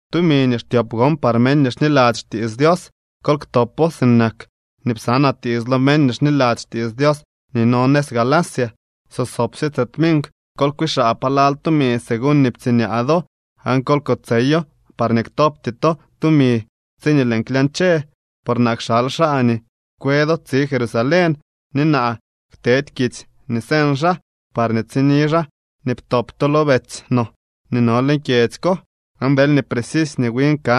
Tumi nii xtyop gon par meñ nii xniladzy xtiits Dios, kol ktopo sinak nii psanaa tiits lo meñ nii xniladzy xtiits Dios nii no nëz Galacia. So sobsye tse tminkw kol kwiixaa palal tumi según nii ptsiñaa do, aan kol kotseyo parñee ktopty to tumi tsiñee lëën klyañche. Por naa kxal xaa nii kwe do tsi Jerusalén, ni naa ktedy kitsy nii señ xaa, parñee tsini xaa nii ptop to lo betsy no nii no leñ kyedzy ko. Aan deelñee precisy nii win ka,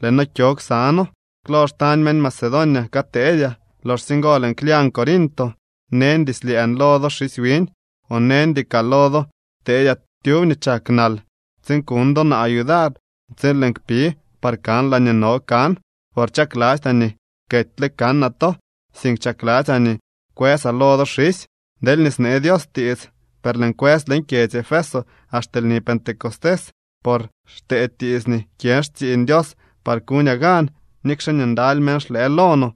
lëë noo kyo ksa noo. Klo xtañ meñ Macedonia kateedyaa. Loxsye ngo lëën klyañ Corinto. Neñdy slyëën lo do xisy wiñ, o neñdy kaa lo do teedyaa tyub nii chak nal, tsiin kuñ do naa yudar tsiin lëën kpi, par kan laañee no kan. Por chaklastyaa nii ketyle kanaa to, sink chakladzyaa nii kwësaa lo do xisy, deelñee snee Dios tiits. Per lëën kwës leñ kyedzy Efeso axte lni Pentecostés, por xtee tiits nii kyën xtsiiñ Dios par kuñaa gan, nikxe nii ndaly meñ xlëë lo no.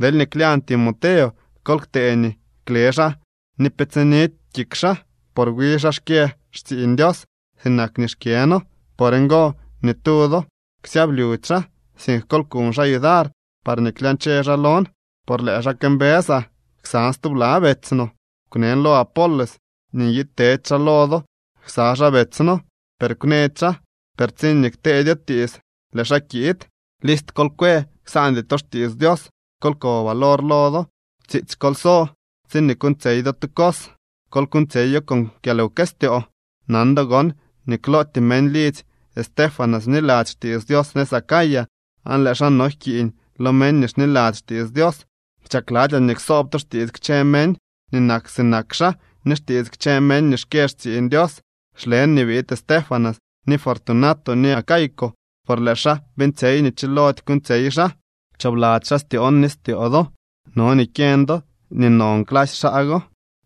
Deelñee klyañ Timoteo, kol ktee nii kle xaa ni pe tsinidy kik xaa, por wi xaa xkyë xtsiiñ Dios sinak nii xkyëno. Por ngo ni tu do ksyablyudy xaa, sink kol kuñ xaa yudar parñee klyañche xaa lon, por lëë xaa këmbësaa ksan stubla betsy no. Kwnen lo Apolos nii nyiid tedy xaa lo do ksa xaa betsy no, per kwnëdy xaa. Per tsiñee kteedyo tiits lëë xaa kiid. List kol kwe, ksaandy to xtiits Dios. Kol ko valor lo do, tsiitsy kol so. Tsiñee kuuñtsyey do tu cos, kol kuuñtsyeyo con kyalwkëstyoo. Nan do gon nii klootyee meñ lidzy Estéfanas bniladzy xtiits Dios nëz Acaya, aan lëë xaa no jkiiñ lo meñ nii xniladzy xtiits Dios. Chakladzyaa nii ksoob to xtiits kchë meñ nii nak sinak xaa ni xtiits kchë meñ nii xkyë xtsiiñ Dios. Xlen nii biid Estéfanas ni Fortunato ni Acaico, por lëë xaa beeñtsyey nii chilody kuuñtsyey xaa. Pchoobladzy xaa styoon ni styoo do. No nii kyeñ do nii non clasy xaa go.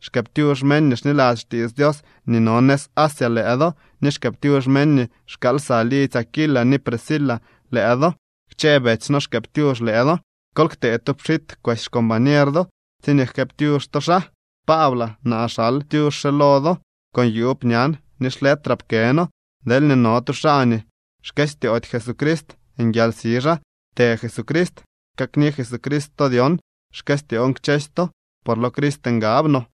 Xkëëptyux meñ nii xniladzy xtiits Dios nii no nëz Asia lëë do ni xkëëptyux meñ nii xkaal lsa lidzy Aquila ni Prisca lëë do. Kchë betsy no xkëëptyux lëë do. Kol ktee tu pxit kwesy xcombañer do tsiñee jkëëptyux to xaa. Paablaa, naa xal tyux re lo do con yuub ñan ni xletraa pkëno. Deelñee no tu xaa nii xkëstyoody Jesucrist, nguialsi xaa. ¡Të Jesucrist! Kakni Jesucrist to dyon. Xkëstyoon kchësy to por lo Crist ngab no.